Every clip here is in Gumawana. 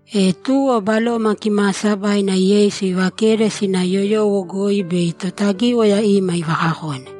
E tuwo Baloma Kimaasabaina Yeisu ivakede sina yoyowo goi bei Totagíwaya ima ivakakone.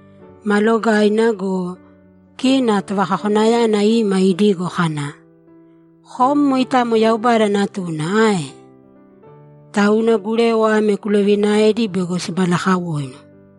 Ma logaaina go, kina Tovakakonayana ima idigo kana, ‘Kom moitamo Yaubada Natuna ae? Tauna gurewa ame kulovinaēdi bego simalakawoinu.’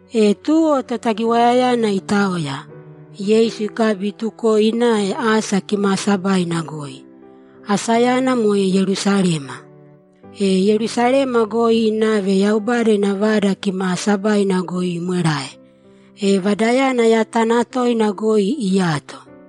E tuwo Totagiwayayana itaoya, Yeisu ikabi itukoe inave asa kimaasabaina goi. Asayana moe Yerusalema. E Yerusalema goi inave Yaubada ina Vada Kimaasabaina goi imwerae, e Vadayana yatana toina goi iyato.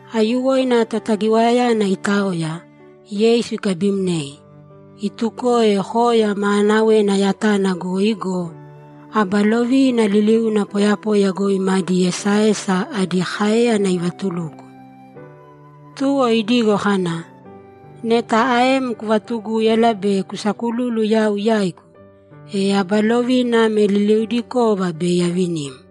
Aiyuwoina Totagiwayayana itaoya, Yeisu ikabimnei, itukoe koya maanawena yatana goi go, aba lovina liliuna poyapoya goi madi esaesa adi káeyana ivatuluko. Tuwo idigo kana, ‘Neta aem kuvatugúyala be kusakululu yau yaigu, e aba lovina ame liliudikova bei avinim.’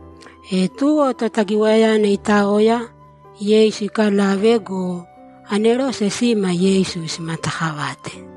E tuwo Totagiwayayana itaoya, Yeisu ikalave go, anerose sima Yeisu simataakavate.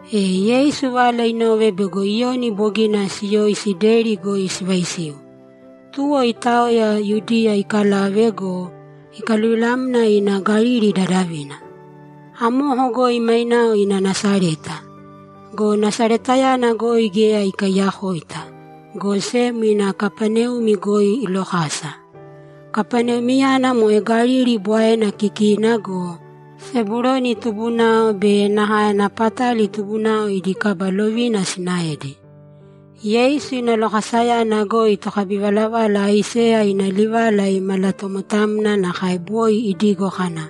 E Yeisu vala inove bego Iyoni bogina siyoisi deri goi sivaisiu, tuwo itaoya Yudiya ikalave go, ikaluvilamna ina Galili dadavina. Amoko goi mainao ina Nasareta. Go Nasaretayana goi geya ikaiyakoita, go sem ina Kapaneumi goi ilokasa. Kapaneumiyana moe Galili Bwaena kikina go, Sebuloni tubunao be nakae Napatali tubunao idi kaba lovina sinaedi. Yeisu ina lokasayana goi tokabivalavala Aiseya ina livala imalatomotamna nakae boi idigo kana,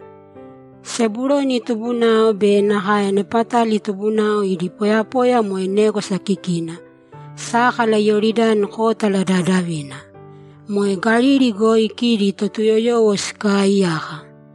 ‘Sebuloni tubunao be nakae Napatali tubunao idi poyapoya moe négwasa kikina, sákala Iyoridani kótala dadavina. Moe Galili goi kidi Totuyoyowo sikaaiyaka.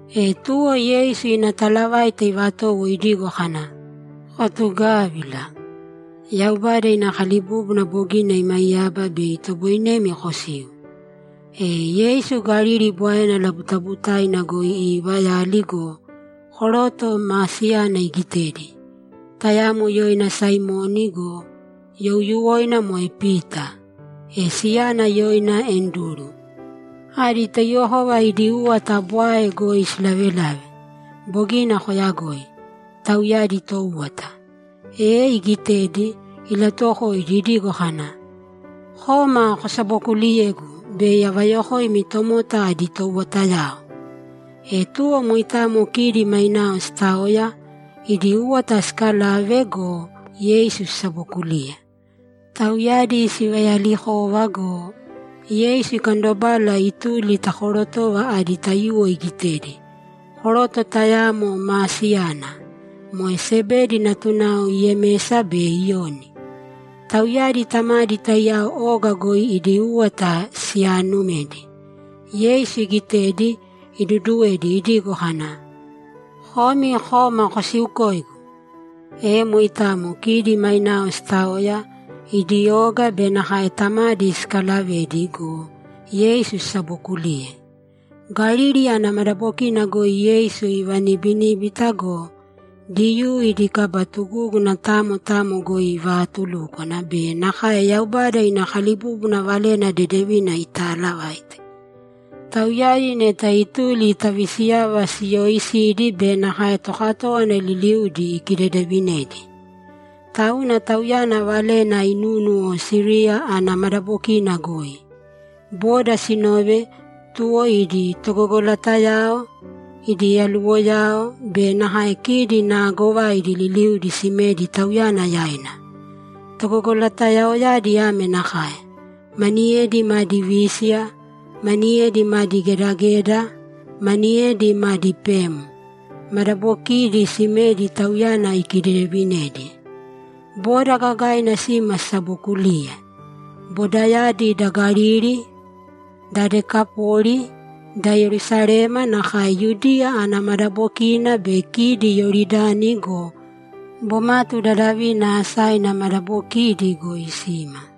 E tuwo Yeisu ina talavaita ivatowo idigo kana, ‘Kotugavīla! Yaubada ina kalibúbuna bogina imaiyaba bei itoboinemi kosiu.’ E Yeisu Galili Bwaena labutabutaina goi iivayali go, koroto maa siyana igitedi; tayamo yoina Saimoni go, youyuwoina moe Pita, e siyana yoina Anduru. Adi taiyuwokova idi úwata bwae goi silavelave. Bogina koyagoi. Tauyadi toúwata. E igitedi, ilatuwokoidi idigo kana, ‘Kōma kosabokuliyēgu bei avayokoimi tomota adi touwatayao.’ E tuwo moitamo kidi mainao sitaoya, idi úwata sikalave go, Yeisu sisabokuliye. Tauyadi sivayalikova go, Yeisu ikandobala ituli ta korotova adi taiyuwo igitedi, koroto tayamo maa siyana. Moe Sebedi natunao Yemesa be Iyoni. Tauyadi tamadi taiyao oga goi idi úwata siyaanumedi. Yeisu igitedi, iduduwedi idigo kana, ‘Komi kōma kosiukōigu!’ E moitamo kidi mainao sitaoya, idi oga be nakae tamadi sikalavedi go, Yeisu sisabokuliye. Galili ana madabokina goi Yeisu ivanibiníbita go, Diyuu idi kaba tugúguna tamo tamo goi ivaatulúkwana be nakae Yaubada ina kalibúbuna Valena Dedevina itaalavaite. Tauyadi neta ituli ta visiyava siyooisidi be nakae tokatówana liliudi ikidedeevinedi. Tauna Tauyana valena inúnuwo Siriya ana madabokina goi. Boda sinove, tuwo idi togogolatayao, idi yaluwoyao be nakae kidi naagovaidi liliudi simedi Tauyana yaina. Togogolatayaoyadi ame nakae: Maniyedi madi vísiya, maniyedi madi gedageda, maniyedi madi pem. Madabokiidi simedi Tauyana ikidedevinedi. Boda gagaina sima sisabokuliye. Bodayadi da Galili, da Dekapoli, da Yerusalema nakae Yudiya ana madabokina be kidi Iyoridani go, bomatu dadavina asaina madabokidi goi sima.